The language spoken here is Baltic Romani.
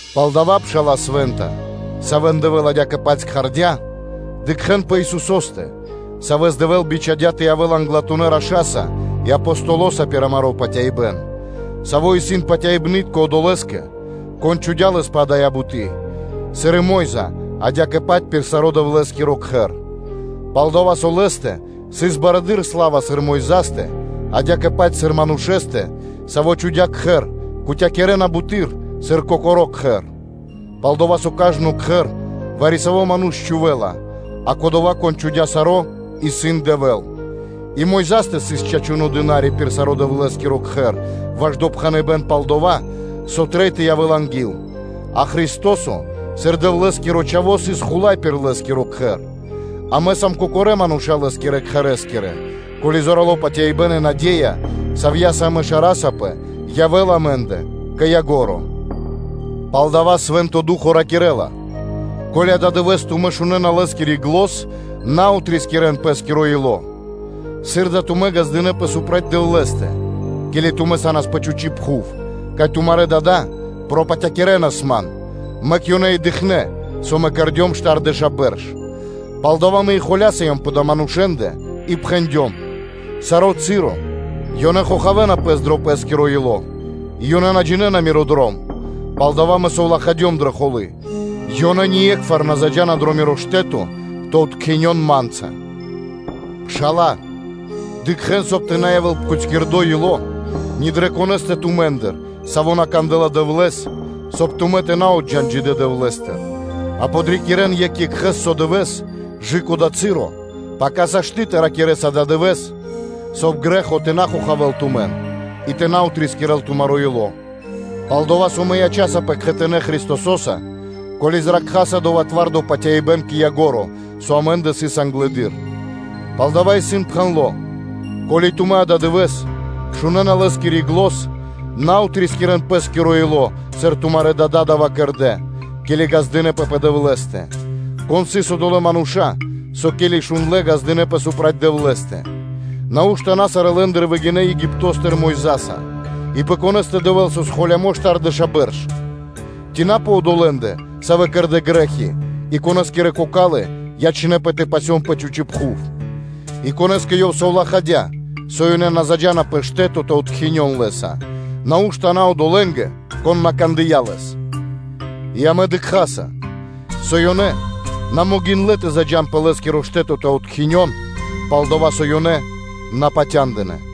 Палдава́, пшала́лэ свэ́нта, савэ́н Дэвэ́л адя́кэ-паць прикхардя, дыкхэ́н пэ Исусо́стэ, Савэс Дэвэ́л бичхадя́ тэ явэ́л англатунэ́ Раша́са пир амаро́ патяибэ́н, Саво́ исын патяибны́тко Одолэ́скэ, Кон чхудя́ Лэс пэ дая́ буты́, сыр и Мо́йза адя́кэ-паць пир саро́ Дэвлэ́скиро Кхэр. Пал-дова́ со Лэ́стэ сыс барэды́р сла́ва, сыр Мойзастэ, адя́кэ-паць сыр манушэ́стэ, саво́ чхудя́ кхэр, кутякирэна (дэ́на паты́в) буты́р, сыр кокоро́ кхэр. Пал-дова́ со кажно кхэр вари-саво́ ману́ш чхувэ́ла, а Кодова́, Кон чхудя́ саро́, исын Дэвэ́л. И Мо́йза сыс чачуно́ дына́ри пир саро́ Дэвлэ́скиро Кхэр ваш допхэныбэ́н пал дова́, со трэй тэ явэ́л анги́л; а Христо́со сыр Дэвлэ́скиро Чхаво́, сыс Хула́й пир Лэ́скиро кхэр; амэ сам кокорэ́ мануша́ Лэ́скирэ кхэрэ́скирэ, ко́ли зорало́ патяибэ́н и наде́я, савья́са амэ шарасапэ, явэ́ла амэ́ндэ кэ ко́нцо (кэ яго́ро). Палдава́ Свэ́нто Ду́хо (Фа́но) ракирэ́ла: “Ко́ли ададывэ́с тумэ́ шунэ́на Лэ́скири зан, на отрискирэн пэ́скиро ило́, сыр да тумэ́ ґаздынэ́пэ пэ Дэвлэ́стэ, ке́ли тумэ́ са́нас пэ чхучи́ пхув; кай тумарэ́ дада́ пропатякирэнас Ман, мэк ёнэ и дыкхнэ́, со Мэ кэрдём штардэша́ бэрш. Палдава́ Мэ и холясыём пэ адалэ́ манушэ́ндэ и пхэндём: ‘Саро́ часо ёнэ хохавэна пэс дро пэ́скиро ило́, и ёнэ на джинэ́на Миро дром’; палдава́ Мэ совлахадём дрэ холы́: ‘Ёнэ ние́кхвар на заджа́на дро Миро штэ́то тэ откхинён Ма́нца’. Пшала́лэ, дыкхэ́н, соб (кай) тэ на явэ́л пхутькирдо ило́ ни дрэ конэ́стэ тумэ́ндыр, саво́ на кандэ́ла Дэвлэ́с, соб (кай) тумэ́ тэ на отджан джидэ́ Дэвлэ́стыр. А подрикирэн екх екхэ́с со дывэ́с кэ/жы́ко дова́ часо, пака сашты́ тэ ракирэ́с “ададывэ́с”, соб (кай) грэ́хо тэ на хохавэ́л тумэн и тэ на отрискирэл тумаро́ ило́. Пал-дова́ со амэ ячасапэ кхэтанэ́ Христосо́са, ко́ли зракхаса дова́ зорало́ патяибэ́н кэ ко́нцо (кэ яго́ро), со амэ́ндэ сыс англэды́р. Палдава́ исын пхэндло́: “Ко́ли тумэ́ ададывэ́с шунэ́на Лэ́скири зан, на отрискирэн пэ́скиро ило́, сыр тумарэ́ дада́ дава́ кэрдэ́, ке́ли ґаздынэ́пэ пэ Дэвлэ́стэ”; кон сыс одолэ́ мануша́, со, ке́ли шундлэ́, ґаздынэ́пэ пэ Дэвлэ́стэ? Нау́што на сарэ́ лэ́ндыр выгинэ́ Египто́стыр Мойзаса? и пэ конэ́стэ Дэвэ́л сыс холямо́ штардэша́ бэрш? Ци на пэ одолэ́ндэ, савэ́ кэрдэ́ грэ́хи, и конэскирэ кокалы́ ячнэ́пэ тэ пасён пэ чхучи́ пхув? И конэ́скэ Ёв совлахадя́, со ёнэ на заджа́на пэ штэ́то тэ откхинён Лэ́са, нау́што на одолэ́нгэ, кон на кандыя́ Лэс? И амэ дыкхаса, со ёнэ на могиндлэ́ тэ заджа́н пэ Лэ́скиро штэ́то тэ откхинён, пал-дова́ со ёнэ на патяндынэ́.